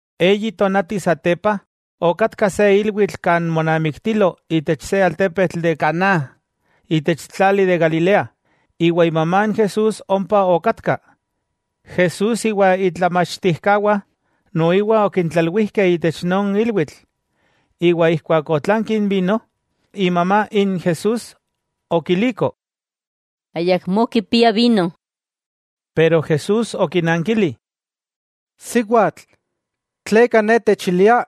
Eyi tonati satepa okatka se ilwitl kan monamiktilo itech se altepetl de Caná itech tlali de Galilea. Iwa imamá n Jesús ompa okatka. Jesús iwa itlamachtijkawah noiwa okintlalwijkeh itech non ilwitl. Iwa ijkuak otlanki n vino, imamá n Jesús okiliko: —Ayakmó kipiah vino. Pero Jesús okinankili: —¿Siwatl, tleka ne techilia?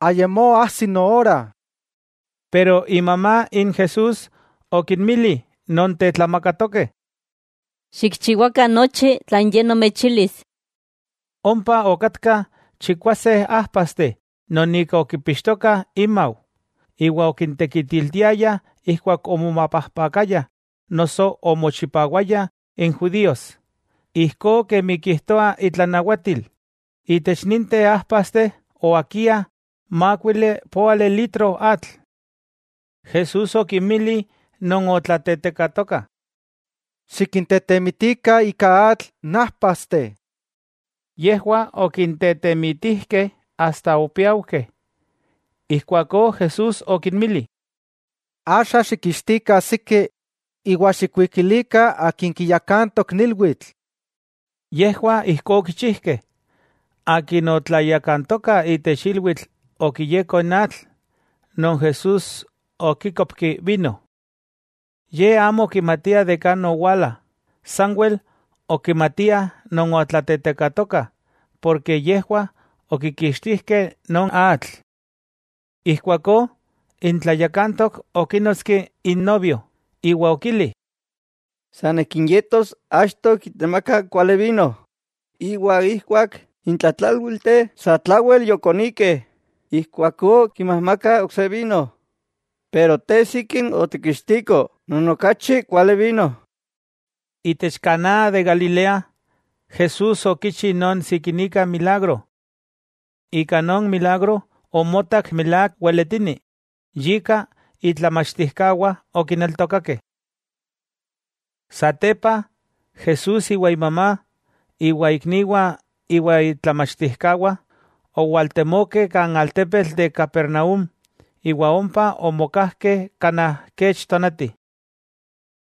Ayamó ajsi noora. Pero imamá n Jesús okinmili non tetlamakatokeh: —Xikchiwakah nochi tlan Ye nomechilis. Ompa okatkah chikwase ajpasteh non ika okipixtokah inmau, iwa okintekitiltiayah ijkuak omomapajpakayah noso omochipawayah n judíos, ijkó kemi kijtoa intlanawatil, itech ninteh ajpasteh oakiah mákuili poali litro atl. Jesús okinmili non otlatetekatokah: —Xikintetemitikah ika atl n ajpasteh. Yejwah okintetemitijkeh asta opiaujkeh, ijkuakó Jesús okinmili: —Axa xikkixtikah siki iwa xikwikilikah akin kiyakantok n ilwitl. Yejwah ijkó okichijkeh. Akin otlayakantoka itech ilwitl okiyeko n atl, non Jesús okíkopki vino. Ye amo okimatia de kan owala, sanwel okimatiah non otlatetekatokah porke yejwah okikixtijkeh non atl. Ijkuakó n tlayakantok okínotski n novio, iwa okili: —San akin yetos achto kitemaka n kuali vino, iwa ijkuak n tlatlálwilteh satlawel yokonikeh, ijkuakó kinmajmakah ok se vino. Pero te sikin otikkixtiko non okachi kuali vino. Itech Caná de Galilea, Jesús okichi non sikinika milagro. Ika non milagro omotak milák weletini, yika itlamachtijkawah okineltokakeh. Satepa, Jesús iwa imamá, iwa ikniwah iwa itlamachtijkawah owaltemokeh kan altepetl de Capernaúm iwa ompa omokajkeh kanaj kech tonati.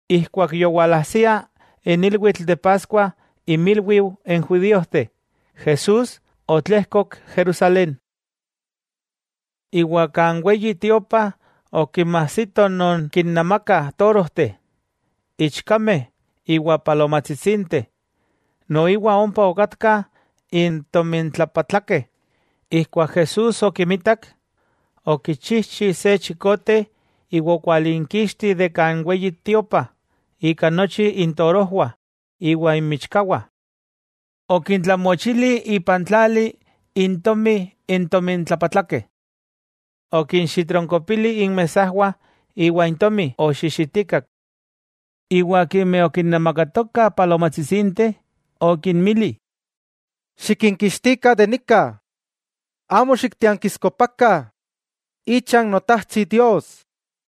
Ijkuak yowalajsia n ilwitl de Paskua inmilwiu n judíojteh, Jesús otlejkok Jerusalén. Iwa kan Weyi Tiopa okinmajsito non kinnamakah torojteh, ichkameh iwa palomajtsitsinteh, noiwa ompa okatkah n tomintlapatlakeh. Ijkuak Jesús okimitak, okichijchi se chikote iwa okwalinkixti de kan Weyi Tiopa ika nochi intorojwah iwa inmichkawah. Okintlamochili ipan tlali intomi n tomintlapatlakeh. Okinxitronkopili inmesajwah iwa intomi oxixitikak. Iwa akimeh okinnamakatokah palomajtsitsinteh okinmili: —¡Xikinkixtikah de nika! ¡Amo xiktiankiskopakah icha n Notajtsi Dios!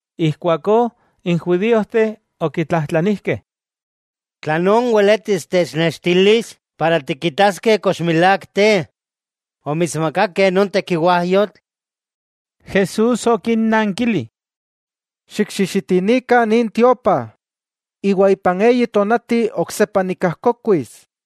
Ijkuakó n judíojteh okitlajtlanijkeh: —¿Tlan weletis technextilis para tikitaskeh kox milák te omitsmakakeh non tekiwajyotl? Jesús okinnankili: —Xikxixitinikah nin tiopa, iwa ipan eyi tonati oksepa nikajkokuis.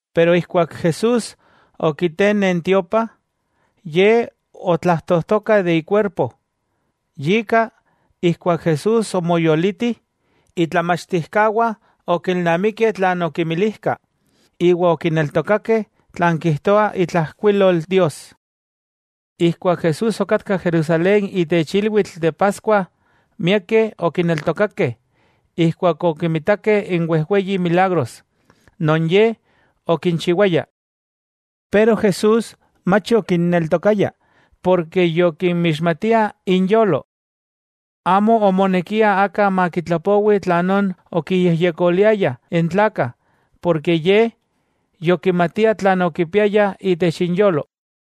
Keman Jesús okitene n tiopa, Ye otlajtojtoka de ikuerpo. Yika, ijkuak Jesús omoyoliti, itlamachtijkawah okilnamikeh tlan okimilijka, iwa okineltokakeh tlan kijtoa itlajkuilol Dios. Ijkuak Jesús okatka Jerusalén itech ilwitl de Paskua, miakeh okineltokakeh ijkuak okimitakeh n wejweyi milagros, non Ye okinchiwaya. Pero Jesús mach okinneltokaya, porke yokinmixmatia inyolo. Amo omonekia aka makitlapowi tlanón okiyejyekoliayah n tlakah, porke Ye yokimatia tlan okipiayah itech inyolo.